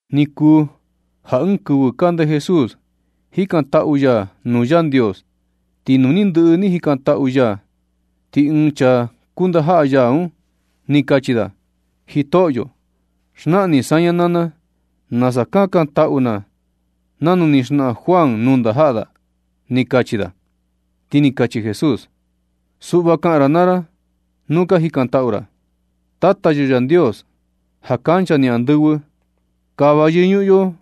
Ni kuu ja ɨɨn kɨvɨ kande Jesús jikantaꞌu ya nuu Yandios, ti nu ni ndɨꞌɨ ni jikantaꞌu ya, ti ɨɨn chaa kuu ndajaꞌa ya un, ni kachi da: ―Jitoꞌyo, xnaꞌan ni saña naa na nasa kakantaꞌu na, nanu ni xnaꞌan Juan nuu ndajaꞌa da ―ni kachi da. Ti ni kachi Jesús: ―Suꞌva kaꞌan ra naa ra nuu ka jikantaꞌu ra: Tata yo Yandios, ja kancha ni andɨvɨ. Kava yɨñuꞌun yo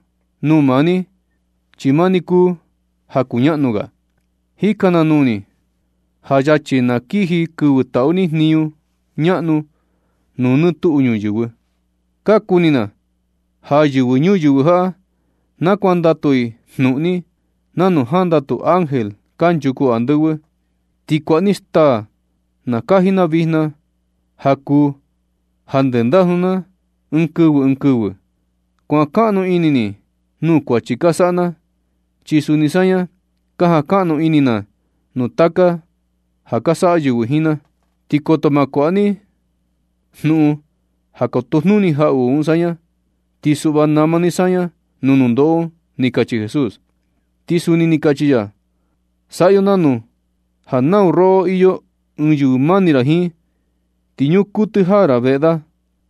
nuu maa ni, chi maa ni kuu ja kuñaꞌnu ga. Jika na nuu ni ja yachi na kiji kɨvɨ taꞌu ni jniñu ñaꞌnu nuu nɨɨ tuꞌu ñuyɨvɨ. Ka kuni na ja yɨvɨ ñuyɨvɨ jaꞌa na kuandatu i jnuꞌun ni, nanu jandatu ángel kanchuku andɨvɨ. Ti kuaꞌa ni staa na kaji na vijna ja kuu ja ndendajnu na ɨɨn kɨvɨ ɨɨn kɨvɨ. Kuan kaꞌnu ini ni nuu kuachi ka saꞌa na, chi suni saña ka jankaꞌnu ini na nuu taka ja ka saꞌa yɨvɨ jiin na. Ti koto ma kuaꞌa ni jnuꞌun ja kotojnuni jaꞌuꞌu un saña, ti suꞌva nama ni saña nuu nundoꞌo un ―ni kachi Jesús. Ti suni ni kachi ya: ―Saꞌa yo nanu ja nau roꞌo iyo ɨɨn yɨvɨ mani ra jiin, ti ñuu kuɨtɨ jaa ra veꞌe da,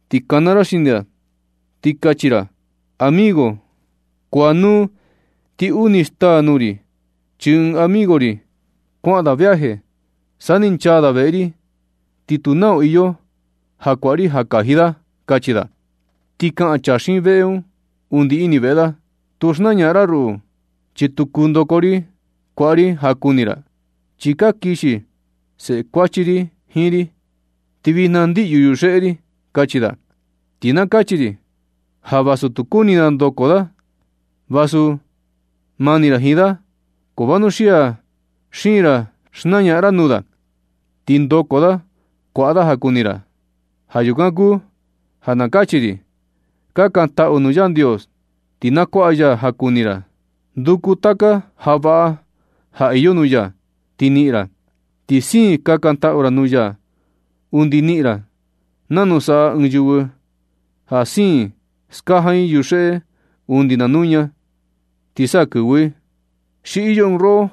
ti kana ra xini da, ti kachi ra: “Amigo, kuaꞌanuu ti uni staa nuu ri, chi ɨɨn amigo ri kuaꞌan da viaje, sa ni nchaa da veꞌe ri, ti tu nau ja iyo ja kuaꞌa ri ja kaji da”, kachi da. Ti kaꞌan chaa xiin veꞌe un undi ini veꞌe da: “Tu xnañaꞌan ra ruꞌu, chi tu kuu ndoko ri kuaꞌa ri ja kuni ra, chi ka kixi seꞌe kuachi ri jiin ri, ti vijna ndiꞌyu yuxeꞌe ri”, kachi da. Ti kachi ri ja vasu tu kuni da ndoko da, vasu mani ra jiin da, ko vanuxia siin ra xnañaꞌan ra nuu da. Ti ndoko da kuaꞌa da ja kuni ra. Ja yukan kuu ja na kachi ri: Kakantaꞌu nuu Yandios, ti na kuaꞌa ya ja kuni ra. Nduku taka ja vaꞌa ja iyo nuu ya, ti niꞌin ra. Ti siin kakantaꞌu nuu ya undi niꞌin ra, nanu saꞌa ɨɨn yɨvɨ ja siin i skajan i yuxeꞌe undi na nuña, ti sa kɨvɨ i. ¿Xi iyo ɨɨn roꞌo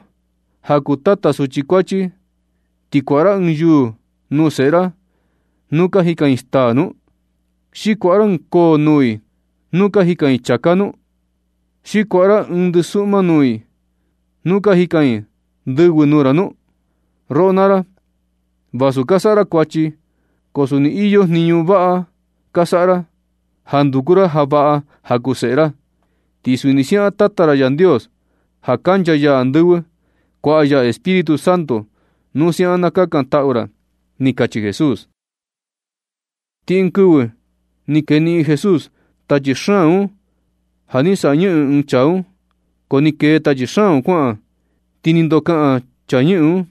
ja kuu tata suchi kuachi, xi kuaꞌa ra ɨɨn yuū nuu seꞌe ra nu ka jikan i staa nu? ¿Xi kuaꞌa ra ɨɨn koo nuu i nu ka jikan i chāká nu? ¿Xi kuaꞌa ra ɨɨn ndɨsuꞌma nuu i nu ka jikan i ndɨvɨ nuu ra nu? Roꞌo naa ra, vasu ka saꞌa ra kuachi, ko suni iyo jniñu vaꞌa ka saꞌa ra ja ka nduku ra ja vaꞌa ja kuu seꞌe ra. Ti suni siaꞌan Tata ra Yandios, ja kancha ya andɨvɨ, kuaꞌa ya Espíritu Santo nu siaꞌan na kakantaꞌu ra ―ni kachi Jesús. Ti ɨɨn kɨvɨ ni keniꞌin Jesús tachi xaan un ja ni saꞌa ñɨꞌɨn ɨɨn chaa un. Ko ni kee tachi xaan un kuaꞌan, ti ni ndokaꞌan chaa ñɨꞌɨn un,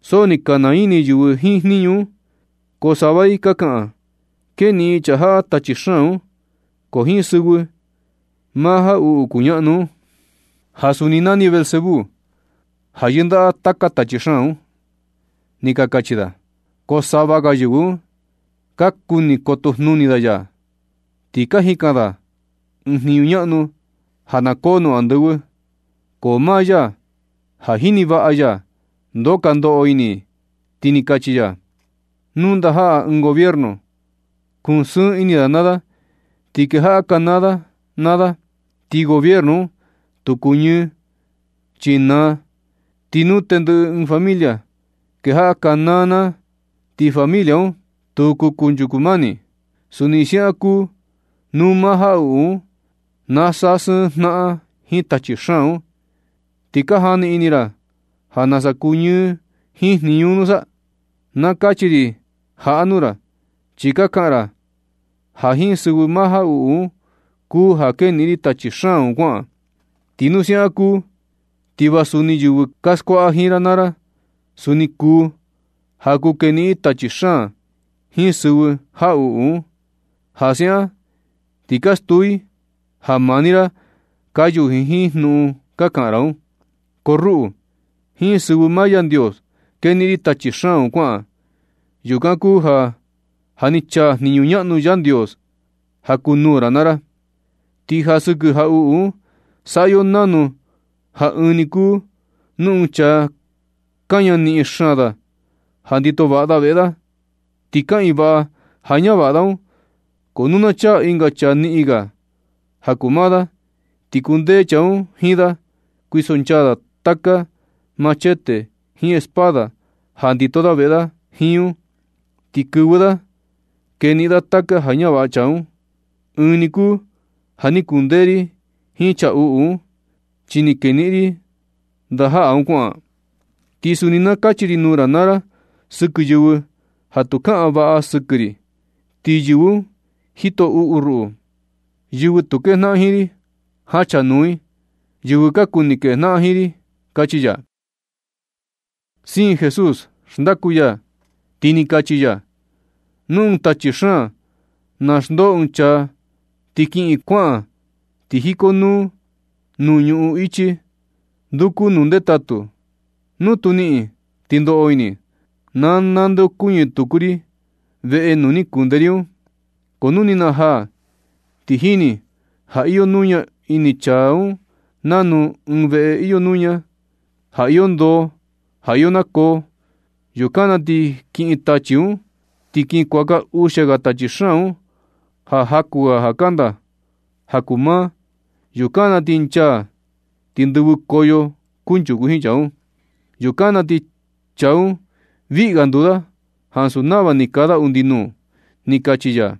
so ni ka naa ini yɨvɨ jiin jniñu un. Ko sava i ni ka kaꞌan: ―Keniꞌin chaa jaꞌa tachi xaan un, ko jiin sɨvɨ maa jaꞌuꞌu kuñaꞌnu un (ja suni nani Beelzebú), ja yɨndaꞌa taka tachi xaan un ―ni ka kachi da. Ko sava ga yɨvɨ un, ka kuni kotojnuni da ya, ti ka jikan da ɨɨn jniñu ñaꞌnu ja na koo nuu andɨvɨ. Ko maa ya ja jini vaꞌa ya ndoo ka ndoꞌo ini i, ti ni kachi ya: ―Nu ndajaꞌa ɨɨn gobierno kusɨɨn ini da naa da ti kejaꞌa kanaa da naa da, ti gobierno un tu kuñɨɨ, chi naa. Ti nu tendɨꞌɨ ɨɨn familia kejaꞌa kanaa naa, ti familia un tu kuu kunchuku mani. Suni siaꞌan kuu nu maa jaꞌuꞌu un na sasɨɨn jnaꞌan jiin tachi xaan un, ¿ti ka jani ini ra ja nasa kuñɨɨ jiin jniñu un nusa? Na kachi ri jaꞌa nuu ra chi ka kaꞌan ra ja jiin sɨvɨ jaꞌuꞌu un kuu ja keniꞌin ri tachi xaan un kuaꞌan. Ti nu siaꞌan kuu, ti va suni yɨvɨ ka skuaꞌa jiin ra naa ra, suni kuu ja kuu keniꞌin i tachi xaan jiin sɨvɨ jaꞌuꞌu un. Ja siaꞌan ti ka stuu i ja maa ni ra ka yuji jiin jnuꞌun ka kaꞌan ra un. Ko ruꞌu, jiin sɨvɨ maa Yandios keniꞌin ri tachi xaan un kuaꞌan. Yukan kuu ja, ja ni chaa jniñu ñaꞌnu Yandios ja kuu nuu ra naa ra. Ti ja sɨkɨ jaꞌuꞌu un, saꞌa yo nanu ja ɨɨn ni kuu nu ɨɨn chaa kaña niꞌin xaan da ja ndito vaꞌa da veꞌe da, ti kaꞌiin vaꞌa ja ñavaꞌa da un. Ko nu na chaa ɨnga chaa niꞌin ga ja kuu maa da, ti kundee chaa un jiin da, kuisonchaa da taka machete jiin espada ja ndito da veꞌe da jiin un, ti kɨvɨ da keniꞌin da taka ja ñavaꞌa chaa un. Ɨɨn ni kuu ja ni kundee ri jiin chaa uꞌu un, chi ni keniꞌin ri ndajaꞌa da un kuaꞌan. Ti suni na kachi ri nuu ra naa ra sɨkɨ yɨvɨ ja tu kaꞌan vaꞌa sɨkɨ ri, ti yɨvɨ un jito uꞌu i ruꞌu. Yɨvɨ tu kejnaꞌan jiin ri, jachanuu i yɨvɨ ka kuni kejnaꞌan jiin ri ―kachi ya. Siin Jesús xndaku ya, ti ni kachi ya: ―Nu ɨɨn tachi xaan na xndoo ɨɨn chaa ti kiꞌin, kuaꞌan ti jikonuu nuu ñuꞌun ichi, nduku nuu ndetatu. Nu tu niꞌin, ti ndoꞌo ini: “Na nandeokuñɨ tuku ri veꞌe nuu ni kunde ri un.” Ko nu ni najaa, ti jini ja iyo nuña ini chaa un nanu ɨɨn veꞌe iyo nuña, ja iyo ndoo, ja iyo nakoo. Yukan na ti kiꞌin tachi un, ti kin kuaka uxia ga tachi xaan un ja jaku ga kanda ga ja kuu maa. Yukan na ti nchaa, ti ñdɨvɨkoyo kunchuku jiin chaa un. Yukan na ti chaa un viꞌi ga nduu da ansu nava ni kaa da undi nuu ―ni kachi ya.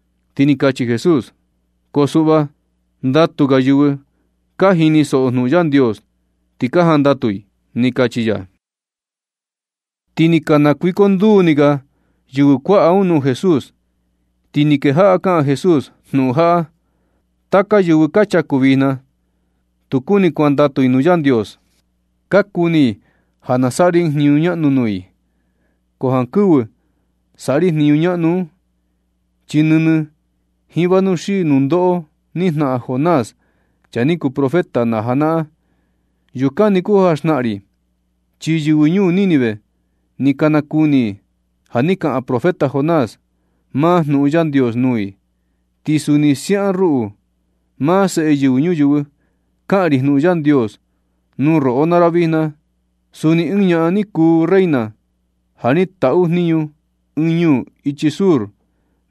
Ti ni kachi Jesús: ―Ko suꞌva ndatu ga yɨvɨ ka jinisoꞌo jnuꞌun Yandios, ti ka jandatu i ―ni kachi ya. Ti ni ka nakuikonduu ni ga yɨvɨ kuaꞌa un nuu Jesús, ti ni kejaꞌa kaꞌan Jesús jnuꞌun jaꞌa: ―Taka yɨvɨ ka chaku vijna, tu kuni kuandatu i nuu Yandios, ka kuni i ja na saꞌa ri ɨɨn jniñu ñaꞌnu nuu i. Ko jankɨvɨ saꞌa ri jniñu ñaꞌnu un, chi nɨnɨ jiin vanuxii nundoꞌo ni jnaꞌan Jonás, chaa ni kuu profeta na janaꞌan, yukan ni kuu ja xnaꞌan ri. Chi yɨvɨ ñuu Nínive ni ka nakuni i ja ni kaꞌan profeta Jonás maa jnuꞌun Yandios nuu i. Ti suni siaꞌan ruꞌu, maa Seꞌe Yɨvɨ Ñuyɨvɨ, kaꞌan ri jnuꞌun Yandios nuu roꞌo naa ra vijna. Suni ɨɨn ñaꞌan ni kuu reina ja ni taꞌu jniñu ɨɨn ñuu ichi sur,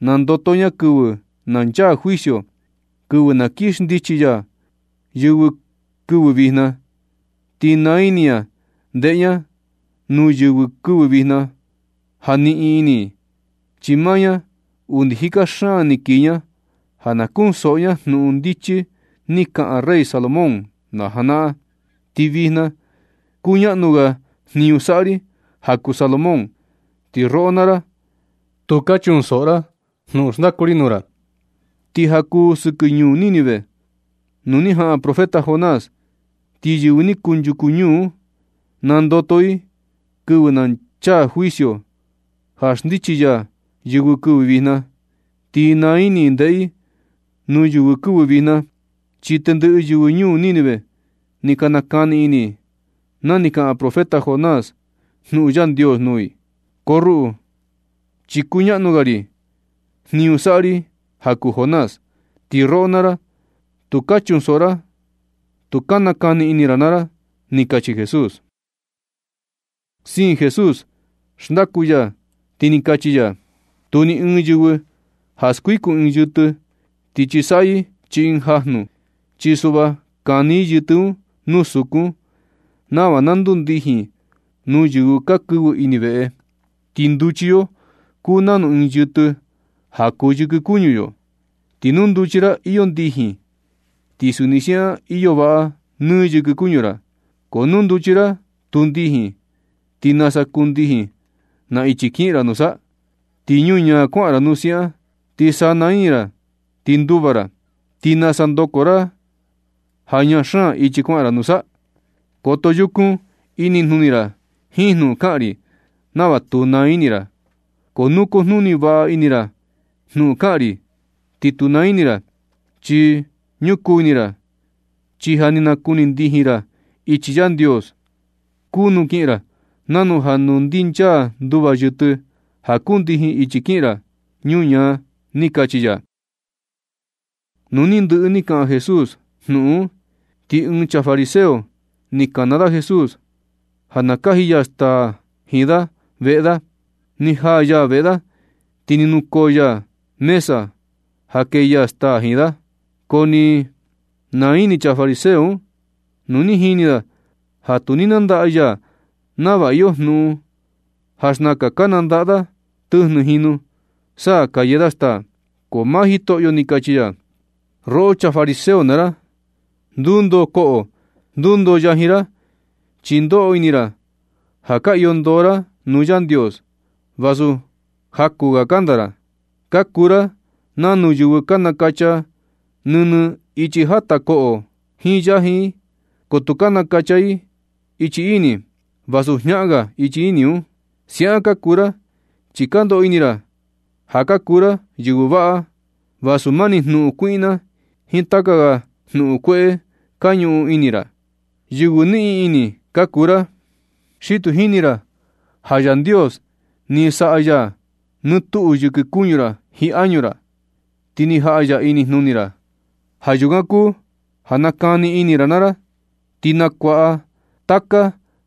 nandoto ña kɨvɨ na chaa juicio, kɨvɨ na kii xndichi ya yɨvɨ kɨvɨ vijna. Ti naa ini ña ndeꞌe ña nuu yɨvɨ kɨvɨ vijna ja niꞌin ini i, chi maa ña undi jika xaan ni kii ña ja na kunsoꞌo ña jnuꞌun ndichi ni kaꞌan rey Salomón, na janaꞌan. Ti vijna kuñaꞌnu ga jniñu saꞌa ri ja kuu Salomón, ti roꞌo naa ra tu ka chunsoꞌo ra jnuꞌun xndaku ri nuu ra. Ti ja kuu sɨkɨ ñuu Nínive, nuu ni jaꞌan profeta Jonás, ti yɨvɨ ni kunchuku ñuu un, nandoto i kɨvɨ na chaa juicio ja xndichi ya yɨvɨ kɨvɨ vijna, ti naa ini i ndeꞌe i nuu yɨvɨ kɨvɨ vijna, chi tendɨꞌɨ yɨvɨ ñuu Nínive ni ka nakani ini i na ni kaꞌan profeta Jonás jnuꞌun Yandios nuu i. Ko ruꞌu, chi kuñaꞌnu ga jniñu saꞌa ri ja kuu Jonás, ti roꞌo naa ra, tu ka chunsoꞌo ra tu nakani ini ra naa ra ―ni kachi Jesús. Siin Jesús xndaku ya, ti ni kachi ya: ―Tu ni ɨɨn yɨvɨ ja skuikun ɨɨn yɨtɨ, ti chisaꞌyɨ chii ɨɨn janu. Chi suꞌva kani i yɨtɨ un nuu sukun nava na kundijin nuu yɨvɨ ja kɨvɨ ini veꞌe. Ti nduchi yo kuu nanu ɨɨn yɨtɨ ja kuu yɨkɨ kuñu yo, ti nuu nduchi ra iyo ndijin, ti suni siaꞌan iyo vaꞌa nɨ yɨkɨ kuñu ra. Ko nu nduchi ra tu kundijin, ti nasa kundijin na ichi kiꞌin ra nusa. Ti ñuñaa kuaꞌan ra nu siaꞌan, ti sana ini ra ti nduva ra. ¿Ti nasa ndoko ra ja ñaa xaan ichi kuaꞌan un nusa? Koto yukun inijnuni ra jiin jnuꞌun kaꞌan ri nava tu naa ini ra. Ko nu kujnuni vaꞌa ini ra jnuꞌun kaꞌan ri, ti tu naa ini ra, chi ñukuu ini ra. Chi ja ni nakuni ndijin ra ja ichi Yandios kuu nu kiꞌin ra nanu ja nu ndinchaa nduva yɨtɨ ja kundijin ichi kiꞌin ra ñuñaa ―ni kachi ya. Nu ni ndɨꞌɨ ni kaꞌan Jesús jnuꞌun un, ti ɨɨn chaa fariseo ni kana da Jesús ja na kaji ya staa jiin da veꞌe da. Ni jaa ya veꞌe da, ti ni nukoo ya mesa ja kee ya staa jiin da. Ko ni naa ini chaa fariseo un nu ni jini da, ja tu ni nandaꞌa ya nava iyo jnuꞌun ja xnaka ka nandaꞌa da tɨjnɨ jinu, sa ka yee da staa. Ko maa Jitoꞌyo ni kachi ya: ―Roꞌo chaa fariseo naa ra, ndundoo koꞌo ndundoo yajin ra, chi ndoꞌo ini ra ja ka iyo ndoo ra nuu Yandios, vasu jaku ga kanda ra. Ka kuu ra nanu yɨvɨ ka nakacha nɨnɨ ichi jata koꞌo i jiin yajin i, ko tu ka nakacha i ichi ini, vasu jñaꞌan ga ichi ini un. Siaꞌan ka kuu ra, chi ka ndoꞌo ini ra ja ka kuu ra yɨvɨ vaꞌa, vasu mani jnuꞌun kuiꞌna jiin taka ga jnuꞌun kueꞌe ka ñuꞌun ini ra. ¡Yɨvɨ niꞌin ini ka kuu ra! ¡Xi tu jini ra ja Yandios ni saꞌa ya nɨ tuꞌu yɨkɨ kuñu ra jiin añu ra, ti ni jaꞌa ya inijnuni ra! Ja yukan kuu ja nakani ini naa ra, ti nakuaꞌa taka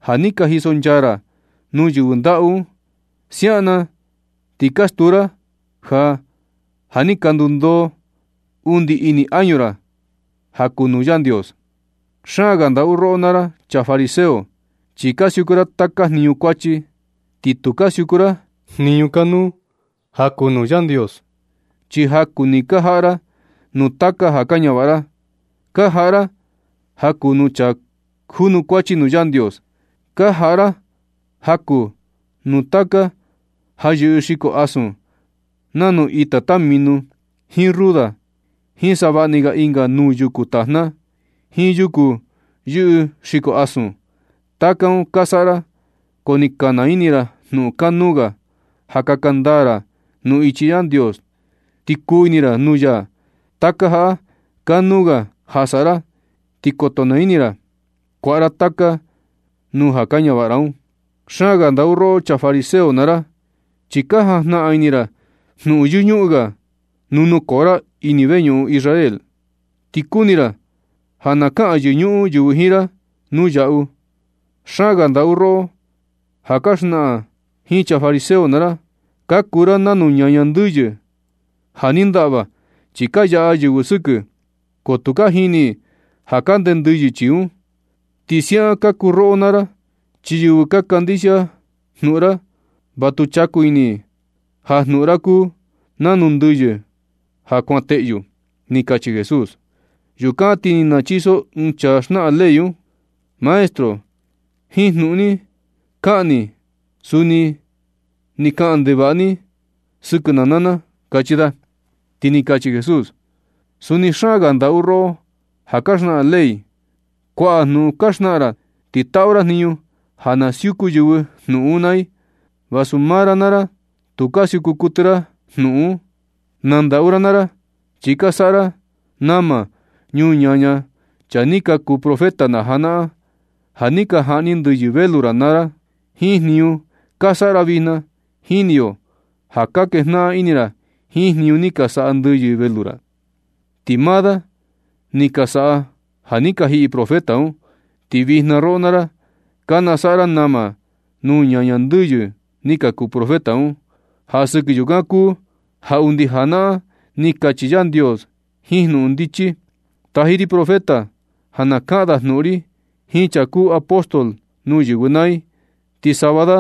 ja ni ka jisonchaa ra nuu yɨvɨ ndaꞌu un. Siaꞌan na ti ka stuu ra ja, ja ni ka nundoo undi ini añu ra ja kuu nuu Yandios. ¡Xaan ga ndaꞌu roꞌo naa ra chaa fariseo! Chi ka siuku ra taka jniñu kuachi, ti tu ka siuku ra jniñu kanuu ja kuu nuu Yandios. Chi jakuu ni ka jaꞌa ra nuu taka ja ka ñavaꞌa ra, ka jaꞌa ra ja kuu nuu chaa junukuachi nuu Yandios. Ka jaꞌa ra jakuu nuu taka ja yɨꞌɨ xiko asun nanu ita tamino, jiin ruda, jiin savaꞌni ga ɨnga nuu yuku tajna, jiin yuku yɨꞌɨ xiko asun. Taka un ka saꞌa ra, ko ni ka naa ini ra jnuꞌun kanuu ga ja kaka ndaa ra nuu ichi Yandios, ti kuu ini ra nuu ya. Taka jaꞌa kanuu ga ja saꞌa ra, ti koto naa ini ra ja kuaꞌa ra taka nuu ja kaa ñavaꞌa ra un. ¡Xaan ga ndaꞌu roꞌo chaa fariseo naa ra! Chi ka jajnaꞌan ini ra jnuꞌun yɨñuꞌun ga nuu nukoo ra ini veñuꞌun Israel un. Ti kuni ra ja na kaꞌan yɨñuꞌun yɨvɨ jiin ra nuu yaꞌu. ¡Xaan ga ndaꞌu roꞌo ja ka xnaꞌan jiin chaa fariseo naa ra! Ka kuu ra nanu ñaña ndɨyɨ ja ni ndaꞌva chi ka yaꞌa yɨvɨ sɨkɨ, ko tu ka jini i ja kande ndɨyɨ chii un. Ti siaꞌan ka kuu roꞌo naa ra, chi yɨvɨ ka kandixia jnuꞌun ra, va tu chaku ini i ja jnuꞌun ra kuu nanu ndɨyɨ ja kuan teꞌyu ―ni kachi Jesús. Yukan ti ni nachiso ɨɨn chaa xnaꞌan ley un: ―Maestro, jiin jnuꞌun ni kaꞌan ni un suni ni kaꞌan ndevaꞌa ni sɨkɨ na naa na ―kachi da. Ti ni kachi Jesús: ―¡Suni xaan ga ndaꞌu tu roꞌo ja ka xnaꞌan ley! Kuaꞌa jnuꞌun ka xnaꞌan ra, ti taꞌu ra jniñu ja na siuku yɨvɨ jnuꞌun un naa i, vasu maa ra naa ra, tu ka siuku kuɨtɨ ra jnuꞌun un. ¡Na ndaꞌu ra naa ra! Chi ka saꞌa ra nama nuu ñaña chaa ni ka kuu profeta na janaꞌan ja ni ka jaꞌni ndɨyɨ velu ra naa da. Jiin jniñu ka saꞌa ra vijna, jini yo ja ka kejnaꞌan ini ra jiin jniñu ni ka saꞌa ndɨyɨ velu ra, chi maa da ni ka saꞌa ja ni ka jiꞌi profeta un. Ti vijna roꞌo naa ra, ka nasaꞌa ra nama nuu ñaña ndɨyɨ ni ka kuu profeta un. Ja sɨkɨ yukan kuu ja undi janaꞌan ni kachi Yandios ɨɨn jnuꞌun ndichi: “Taji ri profeta ja na kaꞌan da jnuꞌun ri jiin chaa kuu apóstol nuu yɨvɨ naa i, ti sava da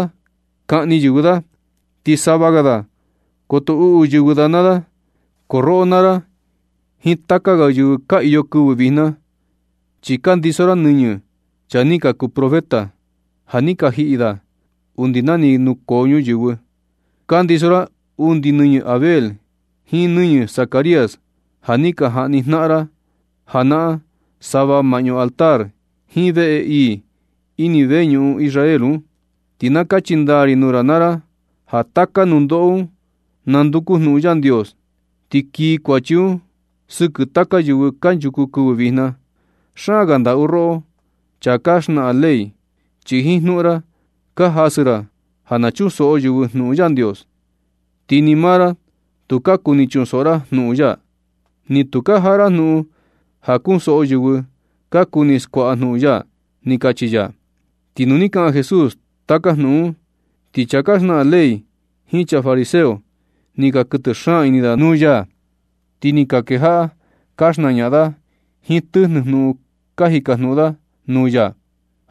kaꞌni yɨvɨ da, ti sava ga da koto uꞌu yɨvɨ da naa da.” Ko roꞌo naa ra jiin taka ga yɨvɨ ka iyo kɨvɨ vijna, chi kandiso ra nɨñɨ chaa ni ka kuu profeta ja ni ka jiꞌi da undi na ni nukoo ñuyɨvɨ. Kandiso ra undi nɨñɨ Abel jiin nɨñɨ Zacarías, ja ni ka jaꞌni jnaꞌan ra janaꞌan sava maꞌñu altar jiin veꞌe ii ini veñuꞌun Israel un. Ti na kachi ndaa ri nuu ra naa ra ja taka nundoꞌo un nanduku jnuꞌun Yandios, ti kii kuachi un sɨkɨ taka yɨvɨ kanchuku kɨvɨ vijna. ¡Xaan ga ndaꞌu roꞌo chaa ka xnaꞌan ley! Chi jiin jnuꞌun ra ka jasɨ ra ja na chunsoꞌo yɨvɨ jnuꞌun Yandios. Ti ni maa ra tu ka kuni chunsoꞌo ra jnuꞌun ya, ni tu ka jaꞌa ra jnuꞌun ja kunsoꞌo yɨvɨ ka kuni skuaꞌa jnuꞌun ya ―ni kachi ya. Ti nu ni kaꞌan Jesús taka jnuꞌun un, ti chaa ka xnaꞌan ley jiin chaa fariseo, ni ka kuɨtɨ xaan ini da nuu ya. Ti ni ka kejaꞌa ka xnañaꞌan da jiin tɨjnɨ jnuꞌun ka jikajnuꞌun da nuu ya,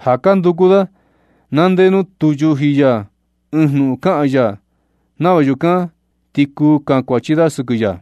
ja ka nduku da na ndee nuu tu yuji ya ɨɨn jnuꞌun kaꞌan ya, nava yukan ti kuu kankuachi da sɨkɨ ya.